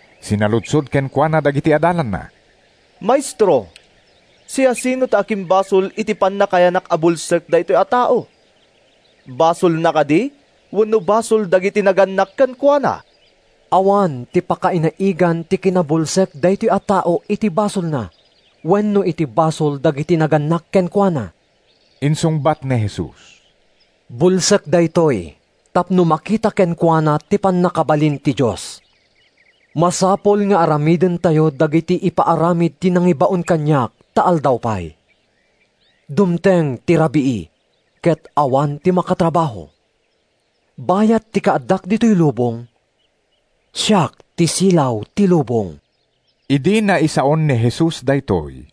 Sinaludsod kenkuana dagiti adalanna, “Maestro, siasino ti akimbasol iti pannakayanak a bulsek daytoy a tao? Basolna kadi wenno basol dagiti nagannak kenkuana?” “Awan ti pakainaigan ti kinabulsek daytoy a tao iti basolna wenno iti basol dagiti nagannak kenkuana,” insungbat ni Jesus. “Bulsek daytoy tapno makita kenkuana ti pannakabalin ti Dios. Masapul nga aramidentayo dagiti ipaaramid ti nangibaon kaniak ta aldaw pay. Dumteng ti rabii ket awan ti makatrabaho. Bayat ti kaaddak ditoy lubong, siak ti silaw ti lubong.” Idi naisaon ni Jesus daytoy,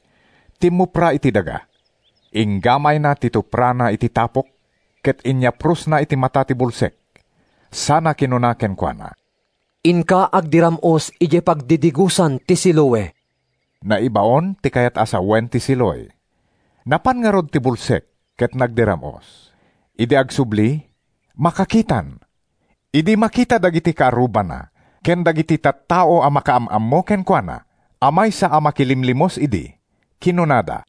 timmupra iti daga. Inggamayna ti tuprana iti tapok ket inyaprosna iti mata ti bulsek sana kinuna kenkuana, “Inka agdiram-os idiay pagdidigosan ti Siloe.” (“Naibaon” ti kayat a sawen ti Siloe.) Napan ngarud ti bulsek ket nagdiram-os. Idi agsubli, makakitan. Idi makita dagiti kaarrubana ken dagiti tattao a makaam-ammo kenkuana a maysa a makilimlimos idi, kinunada,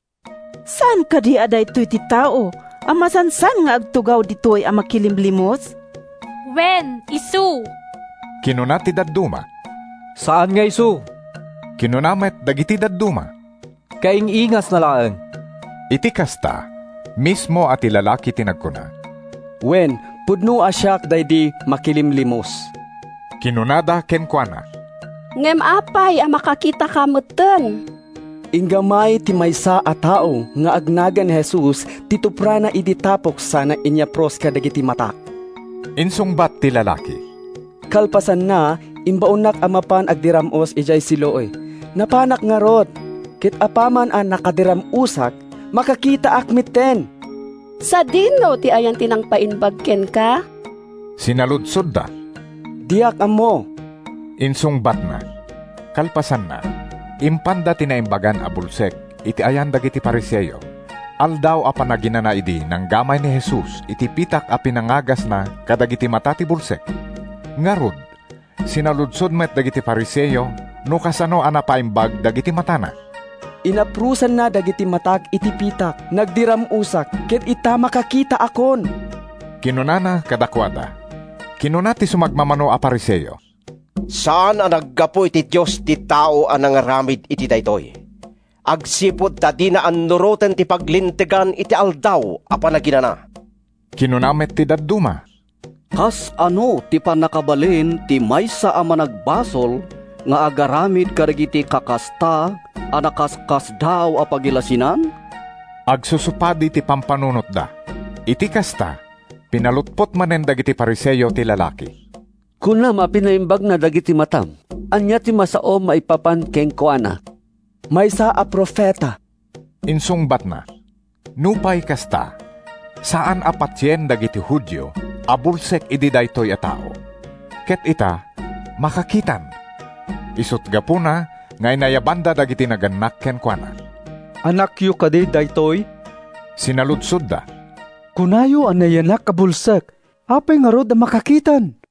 “Saan kadi a daytoy ti tao a masansan nga agtugaw ditoy a makilimlimos?” “Wen, isu!” kinuna ti dadduma. “Saan nga isu,” kinuna met dagiti dadduma. “Kaing-ingasna laeng!” Iti kasta, mismo a ti lalaki ti nagkuna, “Wen, pudno a siak daydi makilimlimos.” Kinunada kenkuana, “Ngem apay a makakitaka metten?” “Inggamay ti maysa a tao nga agnagan Jesus ti tuprana iti tapok sana inyapros kadagiti matak,” insungbat ti lalaki. “Kalpasanna, imbaonnak a mapan agdiram-os idiay Siloe. Napanak ngarud, ket apaman a nakadiram-osak, makakitaak metten!” “Sadino ti ayan ti nangpaimbag kenka?” sinaludsodda. “Diak ammo,” insungbatna. Kalpasanna, impanda ti naimbagan a bulsek iti ayan dagiti Fariseo. Aldaw a Panaginana idi nanggamay ni Jesus iti pitak a pinangagasna kadagiti mata ti bulsek. Ngarud, sinaludsod met dagiti Fariseo no kasano a napaimbag dagiti matana. “Inaprosanna dagiti matak iti pitak, nagdiram-osak, ket ita makakitaakon,” kinunana kadakuada. Kinuna ti sumagmamano a Fariseo, “Saan a naggapu iti Dios ti tao a nangaramid iti daytoy, agsipud ta dina annuroten ti paglintegan iti Aldaw a Panaginana.” Kinuna met ti dadduma, “Kasano ti pannakabalin ti maysa a managbasol nga agaramid kadagiti kakasta a nakaskasdaaw a pagilasinan?” Agsusupadi ti pampanunotda. Iti kasta, pinalutpot manen dagiti Fariseo ti lalaki. “Kunam a pinaimbagna dagiti matam. Ania ti masaom maipapan kenkuana?” “Maysa a profeta,” insungbatna. Nupay kasta, saan a patien dagiti Judio a bulsek idi daytoy a tao, ket ita, makakitan. Isut’ gapuna nga inayabanda dagiti nagannak kenkuana. “Anakyo kadi daytoy?” sinaludsodda. “Kunayo a nayanak a bulsek. Apay ngarud a makakitan?”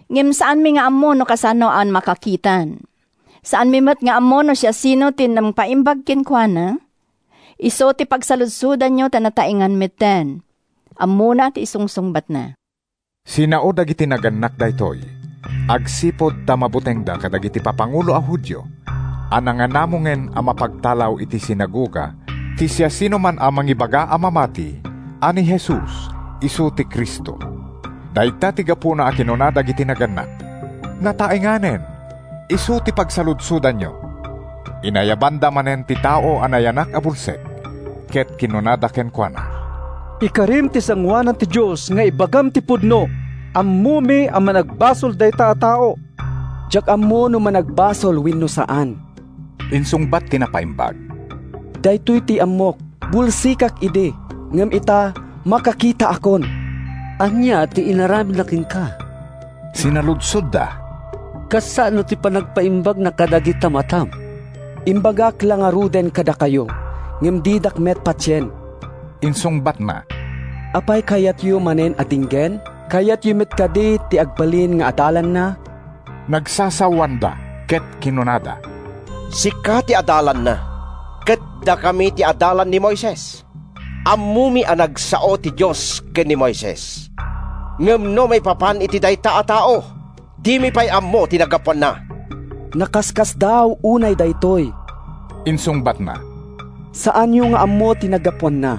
Ngem saanmi nga ammo no kasano a makakitan. Saanmi met nga ammo no siasino ti nangpaimbag kenkuana. Isu ti pagsaludsodanyo ta nataengan metten. Ammona ti isungsungbatna!” Sinao dagiti nagannak daytoy agsipud ta mabutengda kadagiti papangulo a Judio a nanganamongen a mapagtalaw iti sinagoga ti siasinoman a mangibaga a mamati a ni Jesus isu ti Cristo. Dayta ti gapuna a kinuna dagiti nagannak, “Nataenganen; isu ti pagsaludsodanyo!” Inayabanda manen ti tao a nayanak a bulsek ket kinunada kenkuana, “Ikarim iti sangoanan ti Dios nga ibagam ti pudno! Ammomi a managbasol dayta a tao!” “Diak ammo no managbasol wenno saan,” insungbat ti napaimbag. “Daytoy ti ammok: Bulsekak idi, ngem ita, makakitaakon!” “Ania ti inaramidna kenka?” sinaludsodda. “Kasano ti panangpaimbagna kadagita matam?” “Imbagak la ngaruden kadakayo, ngem didak met patien,” insungbatna. “Apay a kayatyo manen a denggen? Kayatyo met kadi ti agbalin nga adalanna?” Nagsasawanda ket kinunada, “Sika ti adalanna, ket dakami ti adalan ni Moises. Ammomi a nagsao ti Dios ken ni Moises. Ngem no maipapan iti dayta a tao, dimi pay ammo ti naggapuanna!” “Nakaskasdaaw unay daytoy!” insungbatna. “Saanyo nga ammo ti naggapuanna,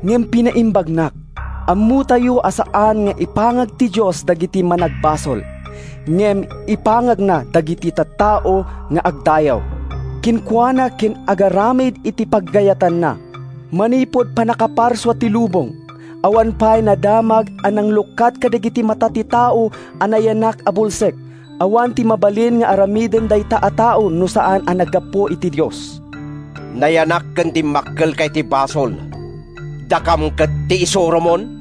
ngem pinaimbagnak! Ammotayo a saan nga ipangag ti Dios dagiti managbasol, ngem ipangagna dagiti tattao nga agdayaw kenkuana ken agaramid iti pagayatanna. Manipud pannakaparsua ti lubong, awan pay nadamag a nanglukat kadagiti mata ti tao a nayanak a bulsek. Awan ti mabalin nga aramiden dayta a tao no saan a naggapu iti Dios.” “Nayanak ken dimmakkelka iti basol, dakam ket ti isuromon?”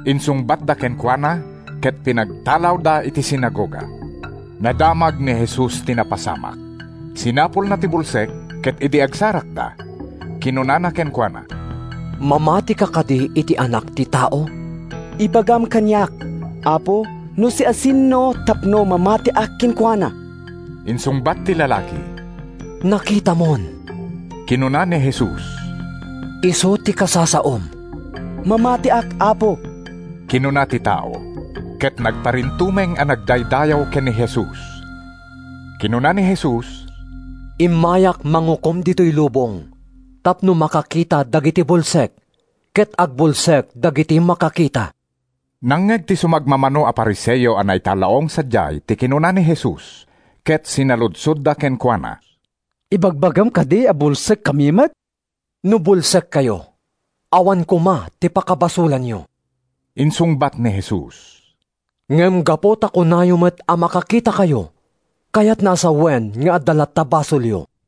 insungbatda kenkuana ket pinagtalawda iti sinagoga. Nadamag ni Jesus ti napasamak. Sinapulna ti bulsek ket idi agsarakda, kinunana kenkuana, “Mamatika kadi iti Anak ti Tao?” “Ibagam kaniak, apo, no siasino tapno mamatiak kenkuana!” insungbat ti lalaki. “Nakitamon,” kinuna ni Jesus. “Isu ti kasasaom.” “Mamatiak, Apo!” kinuna ti tao, ket nagparintumeng a nagdaydayaw ken ni Jesus. Kinuna ni Jesus, “Immayak mangukom ditoy lubong tapno makakita dagiti bulsek, ket agbulsek dagiti makakita.” Nangngeg ti sumagmamano a Fariseo a naitallaong sadiay ti kinuna ni Jesus, ket sinaludsodda kenkuana, “Ibagbagam kadi a bulsekkami met?” “No bulsekkayo, awan koma ti pakabasolanyo,” insungbat ni Jesus. “Ngem gapu ta kunayo met a makakitakayo, kayatna a sawen nga adda latta basolyo.”